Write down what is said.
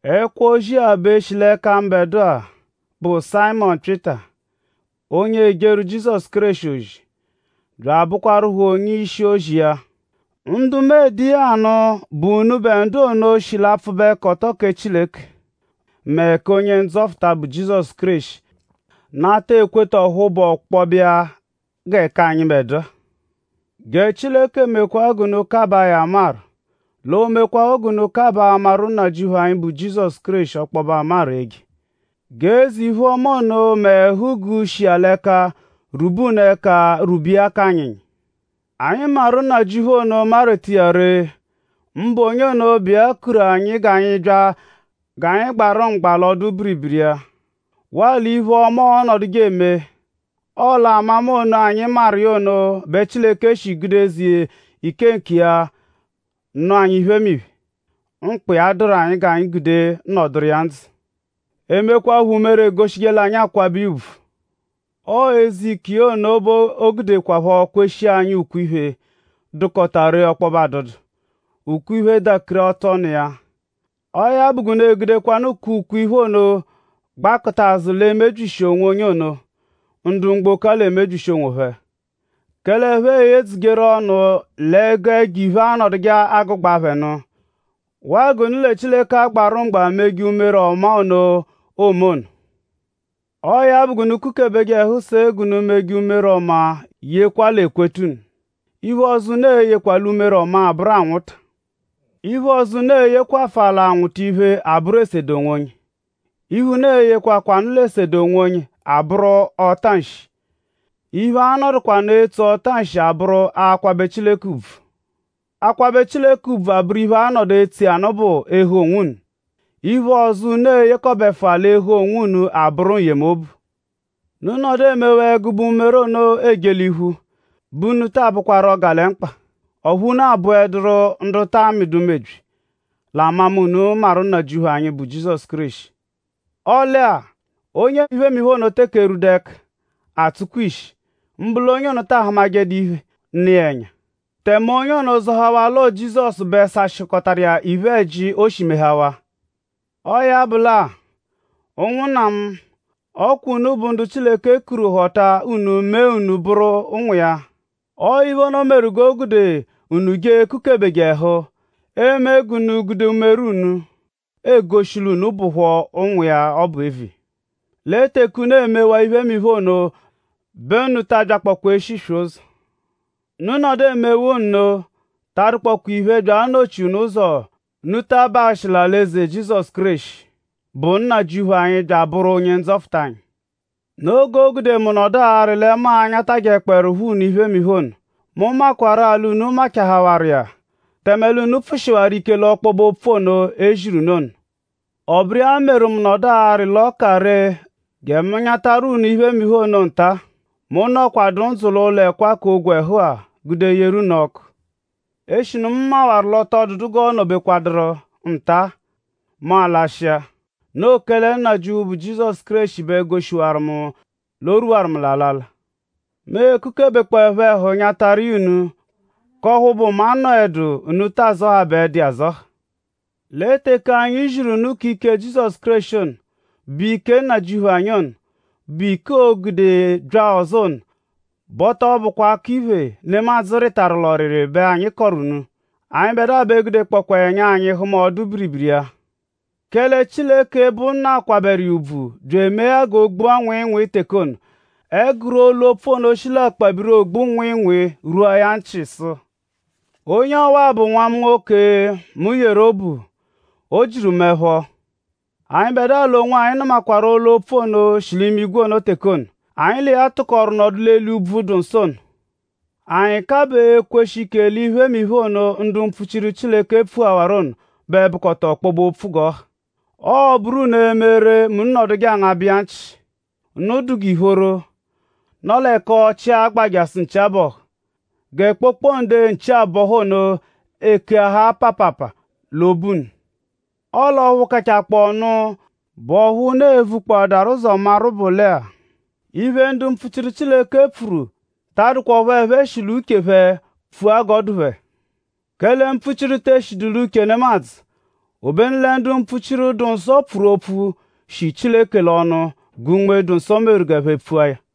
Ẹkwo-ozi-a bẹ shi l'ẹka mbẹdua, bụ Sayịmonu Pyịta, onye ejeru Jizọsu Kéreshi ozi; bya abụkwarupho onye-ishi-ozi iya. Ndu mu ede iya anụ bụ unubẹ ndu ono shi l'apfụbekoto kẹ Chileke mẹ kẹ Onye-Ndzọta bụ Jizọsu Kéreshi nata ekweta ọphu bụ ọkpobe iya gẹ k'anyịbedua. Gẹ Chileke mekwaa g'unu kabaa ya amaru; l'o mekwaaphọ g'unu kabaa amaru Nnajịuphu anyi bụ Jizọsu ọkpobe amaru eje. G'eze-iphe-ọma mẹ ẹhu-guu, shi iya l'ẹka rwube unu ẹka rwube iya k'anyịnyi. Anyi maru Nnajịuphu ono marweta iya ree; mbụ onye ono, bụ iya kuru anyi g'anyi bya g'anyi l'iya gbarụ mgba l'ọdu-biribiri iya; waa l'iphe-ọma, ọonoduje eme. Ọo l'amama ono, anyi maru iya ono bẹ Chileke shi gude eze ike nkiya nụ anyi iphemiphe, mkpa iya dụru anyi g'anyi gude nọduru iya ndzụ; emekwaphọ umere, egoshije l'anyi akwabẹ iya ùbvù. Ọo eze ike iya ono bẹ o gudekwaphọ kweshia anyi ukwe-iphe, dụkota ree ọkpobe adụdu; ukwe-iphe dakiri atụ ọnu iya; ọo ya bụ g'unu egudekwanụ k'ukwe-iphemiphe ono gbakụta azụ l'emebyishi onwonye ono, ndu mgboko-a l'emebyishi onwophẹ; kẹle ẹphe eyedzujeru ọnu l'ẹgu ẹjo-iphe anọduje agụgbabe phẹ nụ; waa g'unu lẹ Chileke agbarụ mgba meje umere ọmaa ono, oome ono. Ọo ya bụ g'unu kukebeje ẹhu se g'unu meje umere ọmaa yekwa l'ekweta unu. Iphe ọzo, unu e-yekwa l'umere ọmaa abụru anwụta. Iphe ọzo, unu e-yekwafụa l'anwụta iphe abụru esede onwonye. Iphe, unu e-yekwakwanụ l'esedeje onwonye abụru ọta-nshi. Iphe, a-nọdukwa nụ etso ọta-nshi abụru akwabẹ Chileke ùbvù. Akwabẹ Chileke ùbvù abụru iphe, a-nọdu etso iya nụ bụ ehe onwunu. Iphe ọzo, unu e-yekọbefua l'ehe onwunu ono abụru n-yemobu. Unu -nọdu emewaa ẹgube umere ono eje l'iphu bẹ unu taa bụkwaru 'ọgalemkpa; ọphu unu abụeduru ndu ta amịdu mebyi; l'amama unu maru Nnajịuphu anyi, bụ Jizọsu Kéreshi. Ọle-a; onye iphemiphe ono teke erwubedu ẹka; atsụkwa ishi; mbụ l'onye ono ta ahụmajedu iphe, nọ ẹnya. Tẹme onye ono zọhawaa l'ọo Jizọsu bẹ sashịkotaru iya iphe-ẹji, o shi mehawaa. Ọo ya bụ lẹ-a; ụnwunna mu; ọ kwa unu bụ ndu Chileke kuru họta unu mee unu bụru ụnwu iya. Ọo iphe ono meru g'o gude unu jee ekukebeje ẹhu eme g'unu gude umere unu egoshi l'unu bụpho ụnwu iya ọbu eviya; lẹ teke unu emewaa iphemiphe ono bẹ unu ta abyakpọkwa eshiswe ụzo. Unu -nọdu emewaa nno ta adụkpoekwa iphe, byakpọo anọ-chi unu ụzo g'unu ta abahụshi l'alị-eze Jizọsu Kéreshi, bụ Nnajịuphu anyi, bya abụru Onye-Ndzọta anyi. Noo g'o gude mu nọdu arị lẹ mu a-nyatajẹkpoerupho unu iphemiphe ono. Mu makwarụ-a l'unu machahawaru iya; tẹme l'unu pfụshiwaru ike l'ọkpobe-opfu ono, e ziru unu ono. Ọ bụru iya meru mu nọdu arị l'ọ ka ree gẹ mu nyatakọtaru unu iphemiphe ono nta-a, mu nọkwadu ndzụ l'ụlo-ẹkwa k'ogwẹhu-a gude yeru unu ọ́kú; eshinu mu mawaru l'ọ tọ dụdu g'ọo nọ-bekwaduru nta-a; mu alashịa; noo kẹle Nnajịuphu, bụ Jizọsu Kéreshi bẹ goshiwaru mu l'o rwuwaru mu l'alala. Mu e-kukebekpọepho ẹhu anyataru iya unu; k'ọphu bụ mu -anọedu; unu ta azọhabaedu iya azọha. Lẹ teke anyi ziru unu k'ike Jizọsu Kéreshi ono, bụ Nnajịuphu anyi ono, bụ ike, oo-gude bya ọzo ono; bẹ ọ tọ bụkwa akọ-iphè, nemadzụ rịtaru l'ọriri iya bẹ anyi kọru unu. Anyịbedua bẹ gudekpọkwa ẹnya anyi hụma ọdu-biribiri iya. Kẹle Chileke, bụ Nna kwabẹru iya ùbvù bya emee ya o gbua nwịinwii teke ono, ẹguru olu-opfu ono shi l'akpabiri Ogbu-nwịinwii rwua ya nchị sụ: “Onye ọwa-a bụ Nwa mu nwoke, mu yeru obu; o jiru mu ẹpho.” Anyịbedua l'onwanyi nụmakwaru olu-opfu ono, shi l'imigwe ono teke ono, anyi l'iya tụkoru nọdu l'eli úbvú, dụ nsọ ono. Anyi kabaa ekweshi ike l'iphemiphe ono, ndu mpfuchiru Chileke pfuhawaru ono bẹ bụkota ọkpobe-opfu g'ọ ha. Ọo-bụru unu eme ree mẹ unu -nọdu angabeje iya nchị; unu dụ g'ìphóró, nọ l'ẹka ọchii agba jasụ nchi abọhu; gẹ kpokpode nchi-abọhu ono ekeahaa paapaapa l'obu unu. Ọle ọphu kachakpọonu, bụ ọphu unu e-vukpọadaru ụzo maru bụ lẹ-a; iphe, ndu mpfuchiru Chileke pfuru ta adụkwa ọphu ẹphe shi l'uche phẹ pfua g'ọ dụ phẹ. Kẹle mpfuchiru te eshidu l'uche nemadzụ. Obenu lẹ ndu mpfuchiru, dụ-nsọ pfuru opfu, shi Chileke l'ọnu gẹ Unme-dụ-nsọ meru g'ẹphe pfua ya.